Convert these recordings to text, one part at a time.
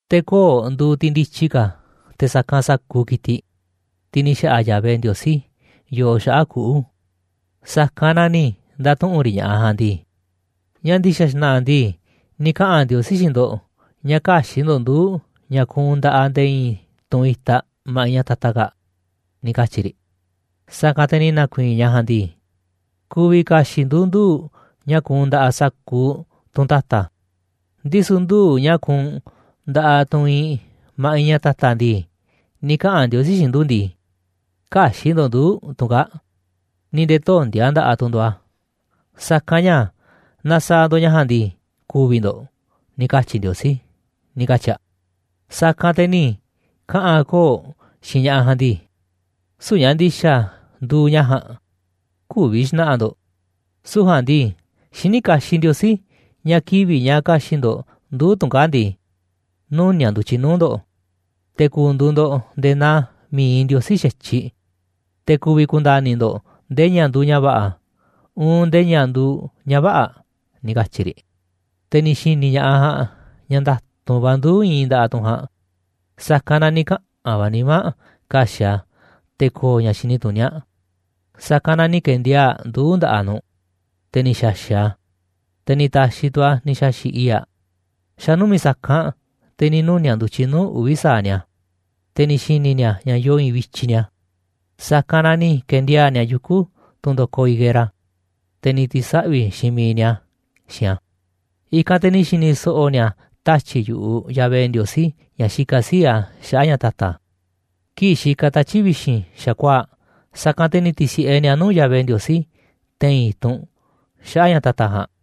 Te̱ koo̱ꞌ nduuꞌ tiꞌ ndityi ka̱ te̱ sa̱kanꞌ sa̱kuuꞌ ki̱tiꞌ, tiꞌ ni̱ xa̱ꞌa̱ Yahvé Ndiosí yoo xaꞌa̱ꞌ kuꞌu̱, sa̱kanꞌ na ni̱ nda̱tuꞌu̱nꞌ riꞌ ña̱ꞌaꞌ ja̱a̱nꞌ ndii: ―¿Ñáá ndi̱xa̱ xna̱ꞌa̱ ndii, ni̱ kaꞌa̱n Ndiosí xiinꞌ ndo̱ꞌ ña̱ kä̱xi̱ꞌ ndo̱ꞌ nduu̱ꞌ ña̱ kuunꞌ nda̱ꞌaꞌ nde̱e̱ i̱i̱n tunꞌ itaꞌ ma̱ꞌiꞌ ña̱ ta̱ta̱ kaa̱ꞌ? ―ni̱ katyi̱ riꞌ. Sa̱kanꞌ te̱ ni̱ na̱ku̱i̱i̱n ñaꞌ ja̱a̱nꞌ ndii: ―Ku̱vi̱ ka̱xi̱ꞌ ndu̱ nduu̱ꞌ ña̱ kuunꞌ nda̱ꞌaꞌ sa̱kuuꞌ tunꞌ ta̱ta̱, ndisu̱ nduu̱ꞌ ña̱ kuunꞌ nda̱ꞌaꞌ tunꞌ iinꞌ ma̱ꞌiꞌ ña̱ ta̱ta̱ ndii, ni̱ kaꞌa̱n Ndiosí xiinꞌ ndu̱ ndii: “Kä̱xi̱ꞌ ndo̱ꞌ nduu̱ꞌ tunꞌ kaa̱ꞌ, ni̱ nde̱e̱ töndi̱a̱ nda̱ꞌaꞌ tu̱ ndo̱ꞌ a̱, sa̱kanꞌ ña̱ naaꞌ sa̱a̱ ndo̱ꞌ ña̱ ja̱a̱nꞌ ndii, ku̱vi̱ ndo̱ꞌ,” ni̱ katyi̱ Ndiosí ―ni̱ katyi̱ aꞌ. Sa̱kanꞌ te̱ ni̱ kaꞌa̱n koo̱ꞌ xiinꞌ ña̱ꞌaꞌ ja̱a̱nꞌ ndii: ―Süu̱ꞌ ña̱ ndi̱xa̱ nduuꞌ ña̱ ja̱a̱nꞌ, kü̱vi̱ xna̱ꞌa̱ ndo̱ꞌ, süu̱ꞌ ja̱a̱nꞌ ndii, xiní kaxiꞌ Ndiosí ña̱ kivi̱ꞌ ña̱ ka̱xi̱ꞌ ndo̱ꞌ nduu̱ꞌ tunꞌ kaa̱ꞌ ndii, nuni̱a̱ꞌ ndu̱tyiꞌ nuu̱ꞌ ndo̱ꞌ, te̱ ku̱ndu̱u̱ ndo̱ꞌ nde̱e̱ naa mi̱iꞌ Ndiosí xa̱tyiꞌ, te̱ ku̱vi̱ ku̱nda̱ni̱ ndo̱ꞌ ndee ña̱ nduuꞌ ña̱ va̱ꞌa̱, uun ndee ña̱ nduuꞌ ña̱ vä̱ꞌa̱ ―ni̱ katyi̱ riꞌ. Te̱ ni̱ xi̱ni̱ ña̱ꞌaꞌ ja̱a̱nꞌ ña̱ nda̱tu̱nꞌ va̱ nduu̱ꞌ iinꞌ nda̱ꞌaꞌ tunꞌ ja̱a̱nꞌ, sa̱kanꞌ na ni̱ kaꞌa̱n va̱ nimá aꞌ ka̱xi̱ꞌ aꞌ a̱ te̱ ko̱o̱ ña̱ xini tuní aꞌ, sa̱kanꞌ na ni̱ ke̱ndiaa̱ꞌ aꞌ nduu̱ꞌ nda̱ꞌaꞌ nu̱ꞌ, te̱ ni̱ xa̱xi̱ꞌ aꞌ a̱, te̱ ni̱ ta̱xi̱ tu̱ aꞌ ni̱ xa̱xi̱ꞌ i̱i̱ꞌ aꞌ. Xa̱ numi̱ꞌ sa̱kanꞌ, te̱ ni̱ nuni̱a̱ꞌ ndu̱tyiꞌ nuu̱ꞌ uvi̱ sa̱aꞌ ni̱a̱, te̱ ni̱ xi̱ni̱ ni̱a̱ ña̱ yoo i̱i̱nꞌ vityiꞌ ni̱a̱, sa̱kanꞌ na ni̱ ke̱ndiaa̱ꞌ ni̱a̱ yuku̱ tunꞌ ndo̱koꞌ higuera, te̱ ni̱ ti̱saꞌvi̱ xiinꞌ miiꞌ ni̱a̱ xiinꞌ a̱. I̱kanꞌ te̱ ni̱ xi̱ni̱ so̱ꞌo̱ ni̱a̱ tatyi̱ꞌ yu̱ꞌuꞌ Yahvé Ndiosí, ña̱ xikaꞌ sii̱ꞌ a̱ xaꞌa̱ꞌ ña̱ ta̱ta̱, kii̱ꞌ xikaꞌ tatyi̱ꞌ vi̱xi̱n xa̱kuaa̱ꞌ, sa̱kanꞌ te̱ ni̱ ti̱si̱ꞌe ni̱a̱ nuu̱ꞌ Yahvé Ndiosí te̱i̱n i̱tunꞌ xaꞌa̱ꞌ ña̱ ta̱ta̱ ja̱a̱nꞌ.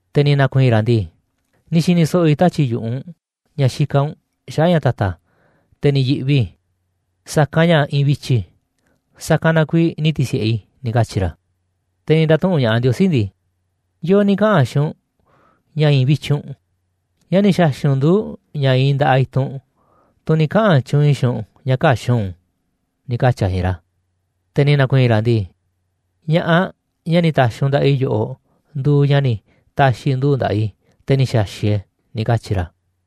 Te̱ ni̱ na̱ku̱i̱i̱n ra̱ ndii: ―Ni̱ xi̱ni̱ so̱ꞌo̱ i̱ tatyi̱ꞌ yu̱ꞌuꞌ u̱nꞌ ña̱ xikaꞌ u̱nꞌ xaꞌa̱ꞌ ña̱ ta̱ta̱, te̱ ni̱ yi̱ꞌvi i̱, sa̱kanꞌ ña̱ i̱i̱nꞌ vityiꞌ i̱, sa̱kanꞌ na kuiiꞌ ni̱ ti̱si̱ꞌe i̱ ―ni̱ katyi̱ ra̱. Te̱ ni̱ nda̱tuꞌu̱nꞌ ña̱ꞌaꞌ Ndiosí ndii: ―¿Yo̱o̱ ni̱ kaꞌa̱n xiinꞌ u̱nꞌ ña̱ i̱i̱nꞌ vityiꞌ u̱nꞌ? ¿Ñáá ni̱ xa̱xi̱ꞌ u̱nꞌ nduu̱ꞌ ña̱ iinꞌ nda̱ꞌaꞌ i̱tunꞌ, tunꞌ ni̱ kaꞌa̱n tyuunꞌ i̱ xiinꞌ u̱nꞌ ña̱ kä̱xi̱ꞌ u̱nꞌ u̱n? ―ni̱ katyi̱ a̱ xiinꞌ ra̱. Te̱ ni̱ na̱ku̱i̱i̱n ra̱ ndii: ―Ña̱ꞌaꞌ, ñaꞌ ni̱ ta̱xi̱ u̱nꞌ nda̱ꞌaꞌ i̱ yoꞌoꞌ nduuꞌ ñaꞌ ni̱ ta̱xi̱ nduu̱ꞌ nda̱ꞌaꞌ i̱, te̱ ni̱ xa̱xi̱ꞌ e̱ꞌ e̱ ―ni̱ katyi̱ ra̱.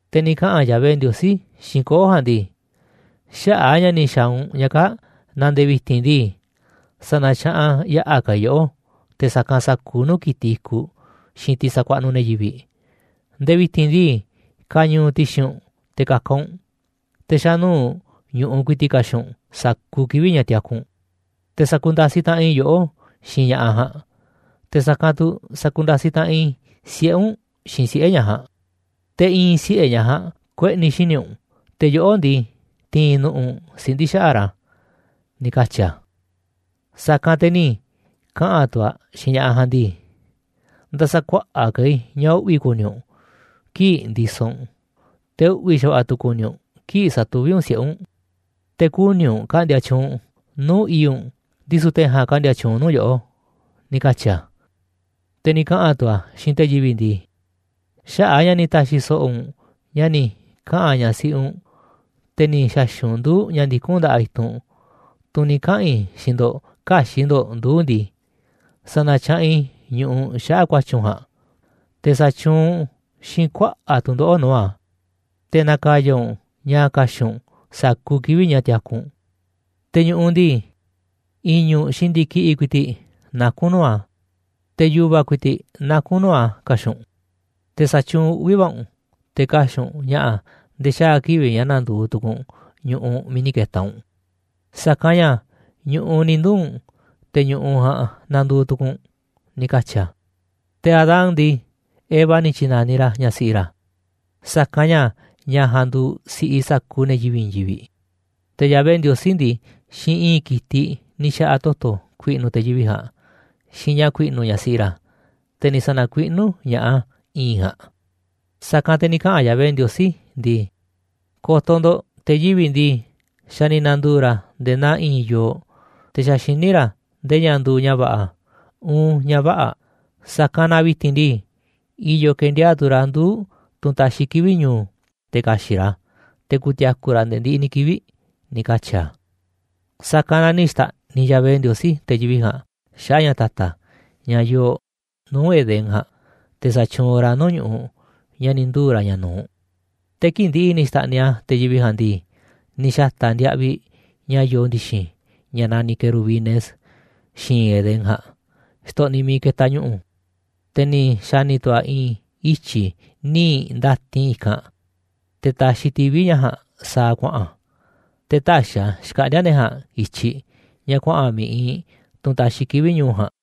Te̱ ni̱ kaꞌa̱n Yahvé Ndiosí xiinꞌ koo̱ꞌ ja̱a̱nꞌ ndii: ―Xaꞌa̱ꞌ a̱ ña̱ ni̱ xa̱a̱ u̱nꞌ ña̱ kaa̱ꞌ na nde̱e̱ vi̱ti̱n ndii, sa̱na̱tyaꞌanꞌ yaꞌa̱ ka̱ i̱ yoꞌó te̱ sa̱kanꞌ sa̱kuuꞌ nuu̱ꞌ ki̱tiꞌ i̱kuꞌ xiinꞌ tiꞌ sakuaꞌnuꞌ ne̱ yivi̱ꞌ. Nde̱e̱ vi̱ti̱n ndii, ka̱ñu̱u̱ ti̱xi̱n u̱nꞌ te̱ ka̱ka̱ u̱nꞌ, te̱ xa̱nuu̱ꞌ ñu̱ꞌuꞌ ku̱i̱ti̱ꞌ ka̱xi̱ꞌ u̱nꞌ sa̱kuuꞌ kivi̱ꞌ ña̱ tiaku u̱nꞌ. Te̱ sa̱ku̱nda̱siꞌ taꞌanꞌ i̱ yoꞌó xiinꞌ ña̱ꞌaꞌ ja̱a̱nꞌ, te̱ sa̱kanꞌ tu̱ sa̱ku̱nda̱siꞌ taꞌanꞌ i̱ siꞌe̱ u̱nꞌ xiinꞌ siꞌe̱ ñaꞌ ja̱a̱nꞌ, te̱ i̱i̱n siꞌe̱ ñaꞌ ja̱a̱nꞌ kueꞌni̱ xíniꞌ u̱nꞌ, te̱ yoꞌó ndii, ti̱i̱n nu̱ꞌu̱ u̱nꞌ siꞌndi̱ xaꞌa̱ꞌ ra̱ ―ni̱ katyi̱ a̱. Sa̱kanꞌ te̱ ni̱ kaꞌa̱n tu̱ a̱ xiinꞌ ña̱ꞌaꞌ ja̱a̱nꞌ ndii: ―Nda̱sa̱kuaꞌa̱ꞌ ka̱ i̱ ña̱ uꞌvi̱ ku̱ni̱ u̱nꞌ kii̱ꞌ ndisoꞌ u̱nꞌ, te̱ uꞌvi̱ xa̱va̱ꞌa̱ tu̱ ku̱ni̱ u̱nꞌ kii̱ꞌ sa̱tuví u̱nꞌ siꞌe̱ u̱nꞌ. Te̱ kuni̱ u̱nꞌ ka̱ꞌndi̱a̱ tyuunꞌ u̱nꞌ nuu̱ꞌ i̱i̱ꞌ u̱nꞌ, ndisu̱ te̱ ja̱a̱nꞌ ka̱ꞌndi̱a̱ tyuunꞌ nuu̱ꞌ yoꞌó ―ni̱ katyi̱ a̱. Te̱ ni̱ kaꞌa̱n tu̱ a̱ xiinꞌ te̱ yivi̱ꞌ ndii: ―Xaꞌa̱ꞌ a̱ ña̱ ni̱ ta̱xi̱ so̱ꞌo̱ u̱nꞌ ña̱ ni̱ kaꞌa̱n ñaꞌ siꞌi u̱nꞌ, te̱ ni̱ xa̱xi̱ꞌ u̱nꞌ nduu̱ꞌ ña̱ ndikún nda̱ꞌaꞌ i̱tunꞌ, tunꞌ ni̱ kaꞌa̱n i̱ xiinꞌ ndo̱ꞌ kä̱xi̱ꞌ ndo̱ꞌ nduu̱ꞌ ndii, sa̱na̱tyaꞌanꞌ i̱ ñu̱ꞌuꞌ xaꞌa̱ꞌ ku̱a̱tyi̱ u̱nꞌ ja̱a̱nꞌ, te̱ sa̱tyuunꞌ u̱nꞌ xiinꞌ kuaꞌa̱ꞌ tu̱ndoꞌo̱ꞌ nuu̱ꞌ a̱, te̱ na̱ka̱ya̱ u̱nꞌ ña̱ ka̱xi̱ꞌ u̱nꞌ sa̱kuuꞌ kivi̱ꞌ ña̱ tiaku u̱nꞌ. Te̱ ñu̱ꞌuꞌ ndii, i̱ñu̱ꞌ xiinꞌ ndi̱kiꞌi̱ꞌ ku̱i̱ti̱ꞌ naku̱n nuu̱ꞌ a̱, te̱ yu̱va̱ ku̱i̱ti̱ꞌ naku̱n nuu̱ꞌ a̱ ka̱xi̱ꞌ u̱nꞌ. Te̱ sa̱tyuunꞌ uꞌvi̱ va̱ u̱nꞌ te̱ ka̱xi̱ꞌ u̱nꞌ ña̱ꞌa̱ nde̱e̱ xaa̱ kivi̱ꞌ ña̱ na̱ndu̱u̱ tu̱ku̱u̱ u̱nꞌ ñu̱ꞌuꞌ miiꞌ ni̱ ke̱ta̱ u̱nꞌ, sa̱kanꞌ ña̱ ñu̱ꞌuꞌ ni̱ nduu̱ꞌ u̱nꞌ, te̱ ñu̱ꞌuꞌ ja̱a̱nꞌ na̱ndu̱u̱ tu̱ku̱u̱ u̱nꞌ ―ni̱ katyi̱ a̱. Te̱ Adán ndii, Eva ni̱ tyi̱na̱niꞌ ra̱ ñaꞌ siꞌi ra̱, sa̱kanꞌ ña̱ ñaꞌ ja̱a̱nꞌ nduuꞌ si̱ꞌiꞌ sa̱kuuꞌ ne̱ yivi̱ꞌ i̱i̱n yivi̱ꞌ. Te̱ Yahvé Ndiosí ndii, xiinꞌ i̱i̱nꞌ ki̱tiꞌ ni̱ xa̱ꞌa̱ a̱ toto̱ ku̱i̱ꞌnu̱ te̱ yivi̱ꞌ ja̱a̱nꞌ, xiinꞌ ña̱ ku̱i̱ꞌnu̱ ñaꞌ siꞌi ra̱, te̱ ni̱ sa̱na̱kuiꞌnú ña̱ꞌaꞌ a̱ i̱i̱nꞌ ja̱a̱nꞌ. Sa̱kanꞌ te̱ ni̱ kaꞌa̱n Yahvé Ndiosí ndii: ―Ko̱to̱ ndo̱ꞌ te̱ yivi̱ꞌ ndii, xa̱ ni̱ na̱ndu̱u̱ ra̱ nde̱e̱ naa i̱i̱n yooꞌ, te̱ xa̱ xiní ra̱ nde̱e̱ ña̱ nduuꞌ ña̱ va̱ꞌa̱, uun ña̱ vä̱ꞌa̱, sa̱kanꞌ na vi̱ti̱n ndii, i̱yo̱ ke̱ndiaa̱ꞌ tu̱ ra̱ nduu̱ꞌ tunꞌ taxiꞌ kivi̱ꞌ ñu̱u̱, te̱ ka̱xi̱ꞌ ra̱ a̱, te̱ ku̱ti̱a̱ku̱ ra̱ nde̱e̱ ndiꞌiꞌ ni̱ kivi̱ꞌ ―ni̱ katyi̱ a̱. Sa̱kanꞌ na ni̱ xta̱ꞌniꞌ Yahvé Ndiosí te̱ yivi̱ꞌ ja̱a̱nꞌ xaꞌa̱ꞌ ña̱ ta̱ta̱, ña̱ yoo nuu̱ꞌ Edén ja̱a̱nꞌ, te̱ sa̱tyuunꞌ ra̱ nuu̱ꞌ ñu̱ꞌuꞌ ña̱ ni̱ nduu̱ ra̱ ña̱ nu̱uꞌ. Te̱ kii̱ꞌ ndi̱ꞌi̱ ni̱ xta̱ꞌniꞌ a̱ te̱ yivi̱ꞌ ja̱a̱nꞌ ndii, ni̱ xa̱ta̱ a̱ ndiaꞌviꞌ ña̱ yoo ndi̱xi̱n, ña̱ naniꞌ querubines xi̱i̱nꞌ Edén ja̱a̱nꞌ, xtoꞌniꞌ miiꞌ ketaꞌ ñu̱ꞌu̱, te̱ ni̱ xa̱ni̱ tu̱ a̱ i̱i̱n ityi̱ nii̱ꞌ ndatin i̱kanꞌ, te̱ taxiꞌ tivi̱ ña̱ ja̱a̱nꞌ sa̱a̱ kuaꞌa̱n, te̱ täxiꞌ a̱ xkaꞌndi̱a̱ ne̱ ja̱a̱nꞌ i̱tyiꞌ, ña̱ kuaꞌa̱n miiꞌ iinꞌ tunꞌ taxiꞌ kivi̱ꞌ ñu̱u̱ ja̱a̱nꞌ.